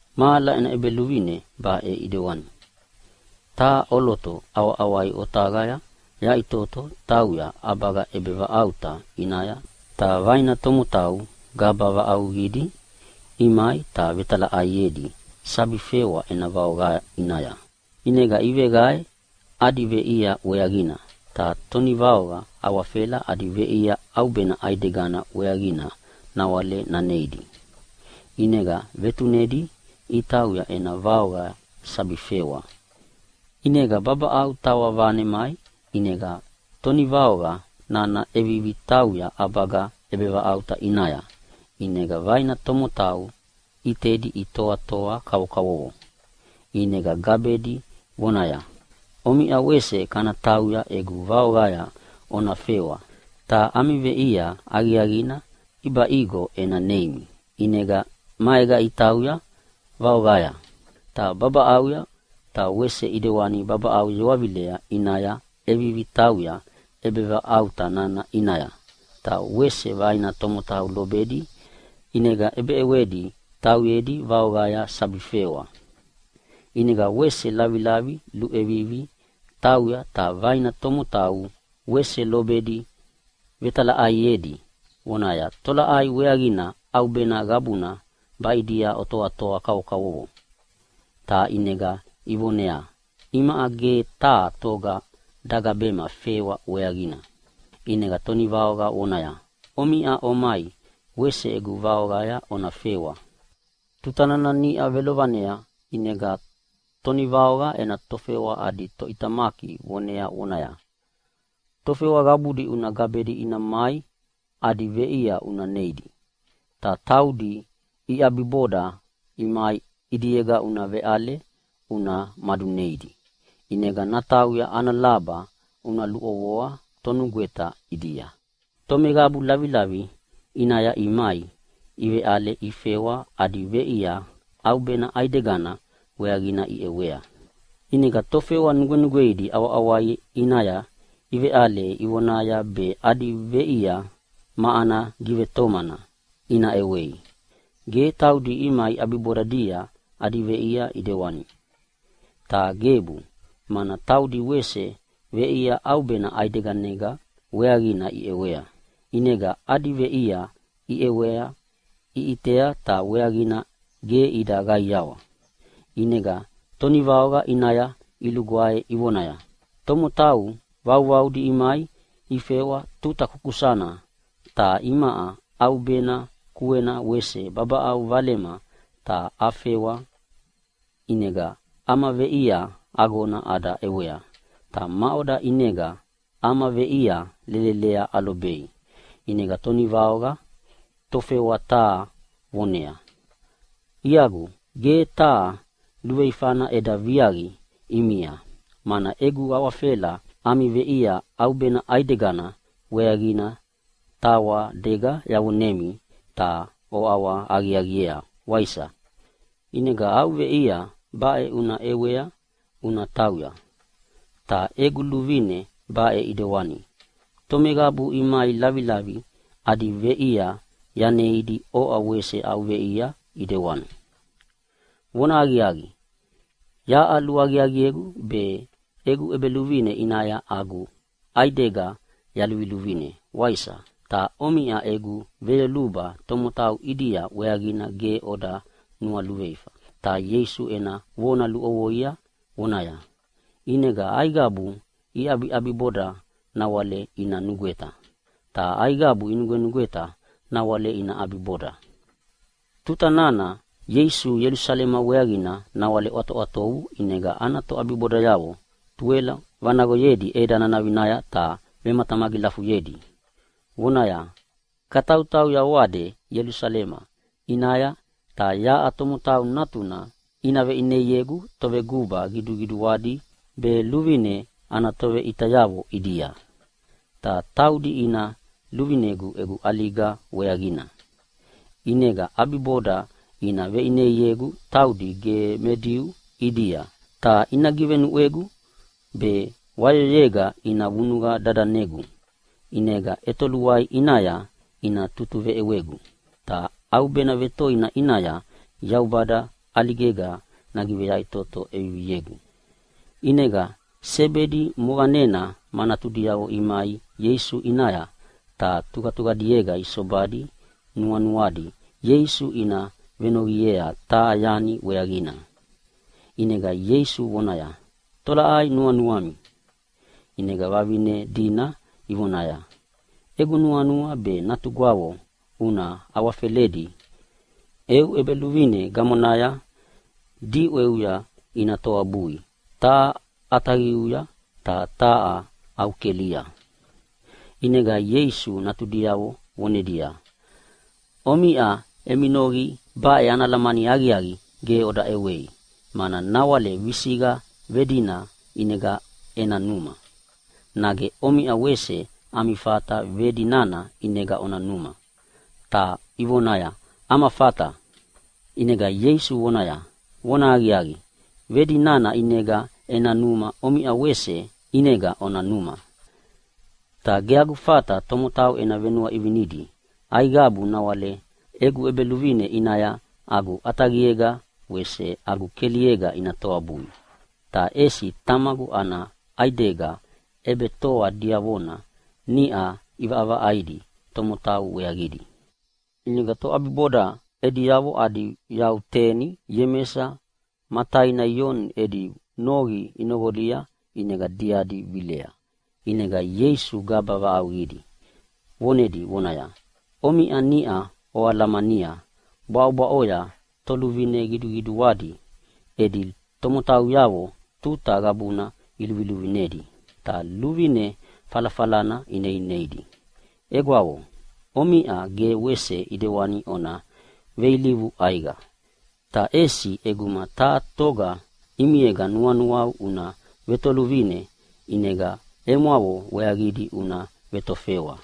“Mahala ena ʼEbeluvine baʼe ʼedewana: Taha ʼoloto ʼawaʼawai otaqaya yaʼitoto tauya ʼabaga ʼebetoavaʼauta ʼinaya ta vaina tomotau gaba vaʼauqidi imai ta vetalaʼaiedi sabi fewa ena vaoqa ʼinaya. ʼInega iveqae adi veʼia weaqina, ta tonivaoqa awafela adi veʼia ʼaubena ʼaidegana weaqina nawale naneidi. ʼInega vetunedi itauya ena vaoqaya sabi fewa. “ʼInega babaʼau tawa vanemai, ʼinega tonivaoqa nana ʼevivi tauya ʼabaga ʼebetoavaʼauta ʼinaya, ʼinega vaina tomotau ʼitedi itoatoa kavokavovo, ʼinega gabedi vonaya, ‘Omiʼa wese kana tauya egu vaoqaya ona fewa ta ami veʼia aqiaqina ʼibaʼigo ena neimi.’ ʼInega maega itauya vaoqaya. Ta babaʼauya ta wese ʼidewani babaʼau yewavilea ʼinaya ʼevivi tauya ʼebetoavaʼauta nana ʼinaya, ta wese vaina tomotau lobedi ʼinega ʼebeʼewedi tauyedi vaoqaya sabi fewa. ʼInega wese lavilavi luʼevivi tauya ta vaina tomotau wese lobedi vetalaʼaiedi vonaya, ‘Tolaʼai weaqina ʼaubena qabuna baʼidia otoatoa kavokavovo?’ “Ta ʼinega ivoneaya, ‘Imaʼa ge taha toga dagabema fewa weaqina.’ “ʼInega tonivaoqa vonaya, ‘Omai, omiʼa wese egu vaoqaya ona fewa.’ “Tuta nana niʼa velovanea ʼinega tonivaoqa ena tofewa adi toʼitamaki vonea vonaya, ‘Tofewa qabudi una gabedi ina mai adi veʼia una neidi. Ta taudi iʼabiboda imaia ʼidiega una veʼale una maduneidi, ʼinega natauya ana laba una luʼovoa tonugweta ʼidia.’ “Tomeqabu lavilavi ʼinaya imai iveʼale ifewa adi veʼia ʼaubena ʼaigedana weaqina iʼewea. ʼInega tofewa nugwenugweidi ʼawaʼawai ʼinaya iveʼale ifewa ivonaya be adi veʼia ma ana givetomana ina ʼewei, ge taudi imai ʼabibodadia adi veʼia ʼidewani. Ta gebu, mana taudi wese veʼia ʼaubena ʼaidegana weaqina iʼewea. ʼInega adi veʼia iʼewea iʼitea ta weaqina ge ida qaiawa, ʼinega tonivaoqa ʼinaya ilugwae ivonaya, ‘Tomotau vauvaudi imai ifewa tuta kusakusana, ta imaʼa ʼaubena kuena wese babaʼau valema ta afewa, ʼinega ama veʼia agona ada ʼewea. Ta maʼoda ʼinega ama veʼia lelelea alobei?’ “ʼInega tonivaoqa tofewa taha voneaya, ‘Iagu, ge taha luveifana eda viaqi ʼimia, mana egu awafela ami veʼia ʼaubena ʼaidegana weaqina tawadega yavonemi ta oʼawahaqiaqiea, waisa? ʼInega au veʼia baʼe una ʼewea una tauya. Yaʼa egu luvine baʼe ʼidewani, tomeqabu imai lavilavi adi veʼia yaneidi oʼa wese au veʼia ʼidewana. Vonahaqiaqi, yaʼa luaqiaqiegu be egu ʼebeluvine ʼinaya agu ʼaidega yaluluvine, waisa? Ta omiʼa egu veyoluba tomotau ʼidia weaqina ge ona nualuveifa.’” Ta Ieisu ena vona luʼovoia vonaya, “ʼInega aiqabu iʼabiʼabiboda nawale ina nugweta, ta aiqabu inugwenugweta nawale ina ʼabiboda.” Tuta nana Ieisu Ielusalema weaqina nawale ʼwatoʼwatovu ʼinega ana toʼabibodayavo tuwelo vanaqoyedi ʼeda nanavinaya ta vematamagilafuyedi, vonaya, “Katautauya oade Ielusalema ʼinaya ta yaʼa Tomotau Natuna ina veʼineiegu toveguba qiduqiduadi be luvine ana toveʼitayavo ʼidia. Ta taudi ina luvine egu ʼaliga weaqina. ʼInega ʼabiboda ina veʼineiegu taudi ge me Diu ʼidia, ta ina givenuʼwegu be wayoyega ina vunuqa dadanegu, ʼinega ʼetoluai ʼinaya ina tutuveʼewegu. Ta ʼaubena vetoina ʼinaya Yaubada ʼaligega nagiveyaʼitoto ʼeviviegu.” ʼInega Sebedi moqanena ma natudiavo imai Ieisu ʼinaya ta tuqatuqadiega isobadi nuanuadi Ieisu ina venoqiea taha yani weaqina. ʼInega Ieisu vonaya, “Tolaʼai nuanuami?” ʼInega vavine dina ivonaya, “Egu nuanua be natugwavo una awafeledi eu ʼEbeluvine gamonaya diʼweuya ina toabui taha au ʼataqia ta taha au kelia.” ʼInega Ieisu natudiavo vonedia, “Omiʼa emi noqi baʼe ana alamani aqiaqi ge oda ʼewei, mana nawale visiqa vedina ʼinega ena numa. Nage omiʼa wese ami fata vedi nana ʼinega ona numa?” Ta ivonaya, “Ama fata.” ʼInega Ieisu vonaya, “Vonahaqiaqi, vedi nana ʼinega ena numa omiʼa wese ʼinega ona numa. Ta ge agu fata tomotau ena venuaʼivinidi aiqabu nawale egu ʼEbeluvine ʼinaya agu ʼataqiega wese agu keliega ina toabui. Ta ʼesi Tamagu ana ʼaigeda ʼebetoa diavona niʼa ʼivaʼavaʼaidi tomotau weaqidi.” ʼInega toʼabiboda ediavo adi yau teni, Iemesa ma taina Ioni edi noqi inoqolia ʼinega diadi vilea. ʼInega Ieisu gaba vaʼauqidi vonedi vonaya, “Omiʼa niʼa oalamania bwaʼobwaʼoya toluvine qiduqiduadi edi tomotauyavo tuta qabuna iluviluvinedi ta luvine falafalana ineineidi. Egwavo, omiʼa ge wese ʼidewana ona veilivu ʼaiqa. Ta ʼesi ʼeguma taha toga ʼimiega nuanuau una vetoluvine, ʼinega emwavo weaqidi una vetofewa.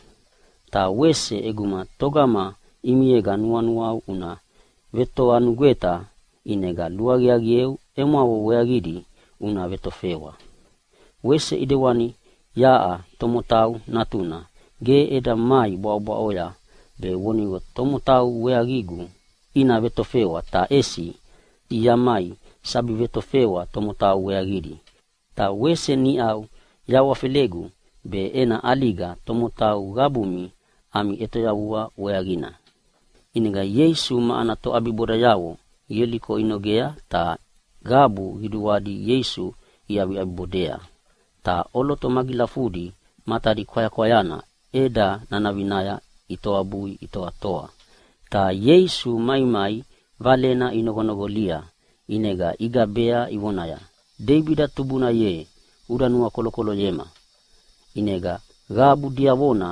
“Ta wese ʼeguma togama ʼimiega nuanuau una vetovanugweta ʼinega luaqiaqieu emwavo weaqidi una vetofewa. Wese ʼidewana yaʼa Tomotau Natuna ge eda mai bwaʼobwaʼoya be vonigo tomotau weaqigu ina vetofewa, ta ʼesi yamai sabi vetofewa tomotau weaqidi, ta wese niʼa yahawafelegu be ena ʼaliga tomotau qabumi ami ʼetoyavua weaqina.” ʼInega Ieisu ma ana toʼabibodayavo Ieliko inogea ta qabu qiduadi Ieisu iʼabiʼabibodea. Ta ʼoloto magilafudi matadi kwayakwayana ʼeda nanavinaya itoabui itoatoa, ta Ieisu maimai valena inoqonoqolia ʼinega igabea ivonaya, “Deibida tubuna ye, uda nuakolokoloyema!” ʼInega qabu diavona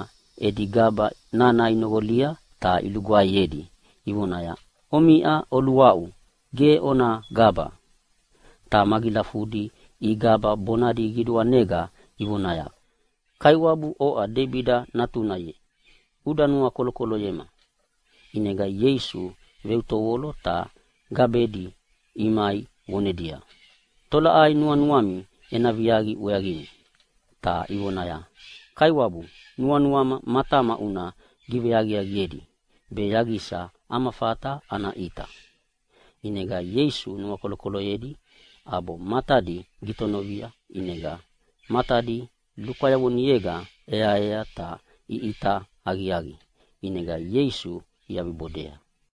edi gaba nana inoqolia ta ilugwaeyedi ivonaya, “Omiʼa oluaʼu, ge ona gaba.” Ta magilafudina igaba bonadi qiduanega ivonaya, “Kaiwabu, oʼa Deibida natuna ye uda nuakolokoloyema!” ʼInega Ieisu veutovolo ta gabedi imai vonedia, “Tolaʼai nuanuami ena viaqi weaqimi?” Ta ivonaya, “Kaiwabu, nuanuama matama una giveaqiaqiedi be yaqisa ama fata ana ʼita!” ʼInega Ieisu nuakolokoloyedi ʼabo matadi gitonovia ʼinega matadi lukwayavonega ʼeaea ta iʼita aqiaqi, ʼinega Ieisu iʼabibodea.